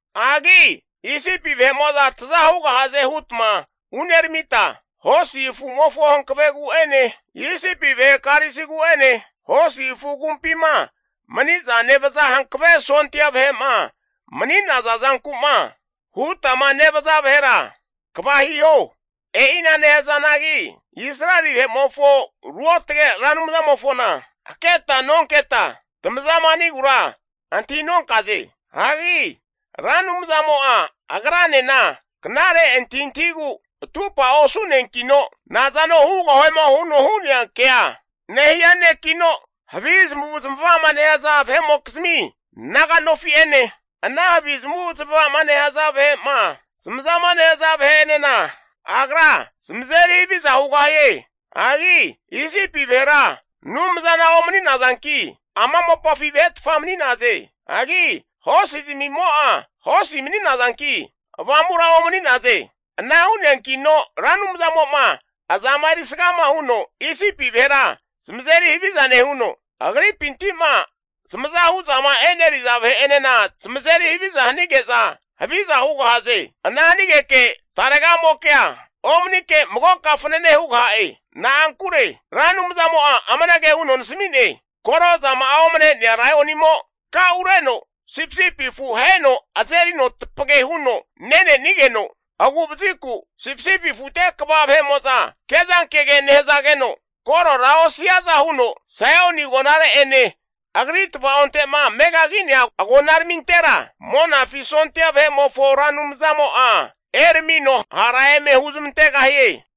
Hagi Isipi vahe'mo'za taza hugahaze hutma uneramita, hosi afumofo hankavegu'ene, Isipi vahe karisigu'ene, hosi afu agumpima mani'za nevaza hankave sondia vahe'ma mani'naza zanku'ma hutama nevaza vahera kva hiho. E'ina nehazanagi Israeli vahe'mofo Ruotage Ra Anumzamofona haketa nonketa, tamazama hanigura antahi nonkaze. Hagi Ra Anumzamo'a agranena knare antahintahigu atupa osu'neankino, nazano hugahuema huno hu'nea ke'a amage anteno nehia nekino, havi zamavu zamava'ma nehaza vahe'mokizmi naga nofi'ene, ana havi zamavu'zmava'ma nehaza vahe'ma zamazama nehaza vahe'enena Agra zamazeri haviza hugahie. Hagi Isipi vahera Anumzana omani'nazanki, ama mopafi vahetfa mani'naze. Hagi hosizmimo'a hosi mani'nazanki avamura omani'naze. Ana hu'neankino Ra Anumzamo'a azama erisga huno Isipi vahera zamazeri haviza nehuno, agripinti'ma zamazahu zama eneriza vahe'enena zamazeri haviza hanige'za haviza hugahaze. Ana hanigeke taregamokea omanike magoka fanane hugaha'e. Na'ankure Ra Anumzamo'a amanage huno nasami'ne, koro zama'a omane'nea laionimo takaureno sipisipi afu aheno azerino tapage huno nenenigeno, agu'vaziku sipisipi afute kva vahe'mo'za kezankege nehazageno korora osiaza huno, Saioni agonare'ene agri tvaonte'ma megagi'nea agonaramintera Monafi sondia vahe'mofo Ra Anumzamo'a eramino hara eme huzmantegahie.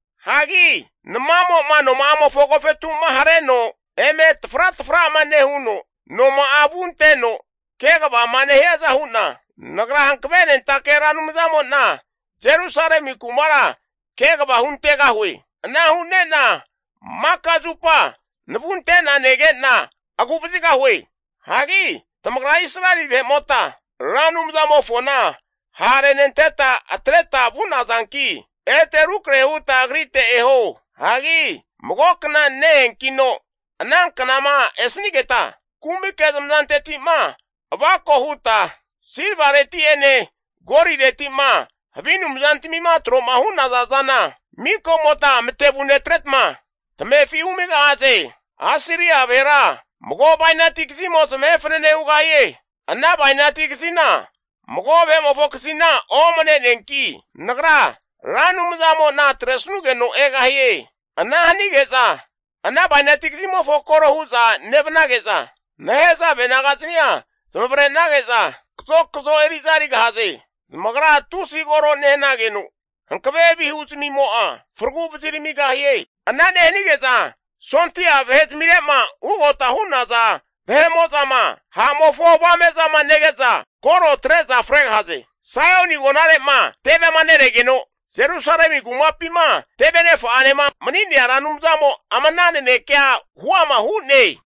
Hagi namamo'ma noma'amofo agofetuma hareno eme tafratafra'ma nehuno, noma'a avunteno kegavama nehiaza hu'na, Nagra hankavenentake Ra Anumzamo'na Jerusalemi kumara kegava huntegahue. Ana hu'ne'na maka zupa navunte'na nege'na, agu'vazigahue. Hagi tamagra Israeli vahe'mota Ra Anumzamofona ha' renenteta atreta vu'nazanki, ete rukrahe huta Agrite eho. Hagi mago kna ne-eankino ananknama esanigeta, kumike tamazanteti'ma avako huta, silvareti'ene golireti'ma havi anumzantamima tro'ma hu'naza zana, miko'mota matevu netretma tamefi humigahaze. Asiria vahera mago bainati kazimo zamahe fanane hugahie. Ana bainati kazina mago vahe'mofo kazina omne'neanki, Nagra Ra Anumzamo'na atresanugeno egahie. Ana hanige'za ana bainati kazimofo koro hu'za nevnage'za, nehazave nagazamia zamavarenage'za kazokazo eri'za erigahaze. Zamagra tusi koro nehanageno hankave vihu zamimo'a, faragu vaziramigahie. Ana nehanige'za sondia vahe zamire'ma ugota hu'naza vahe'mo'zama ha'mofo avame'zama nege'za koro atre'za fregahaze. Saioni agonarema tevema neregeno Jerusalemi kumapima tevenefa'anema mani'nea Ra Anumzamo ama ana nanekea huama hu'ne.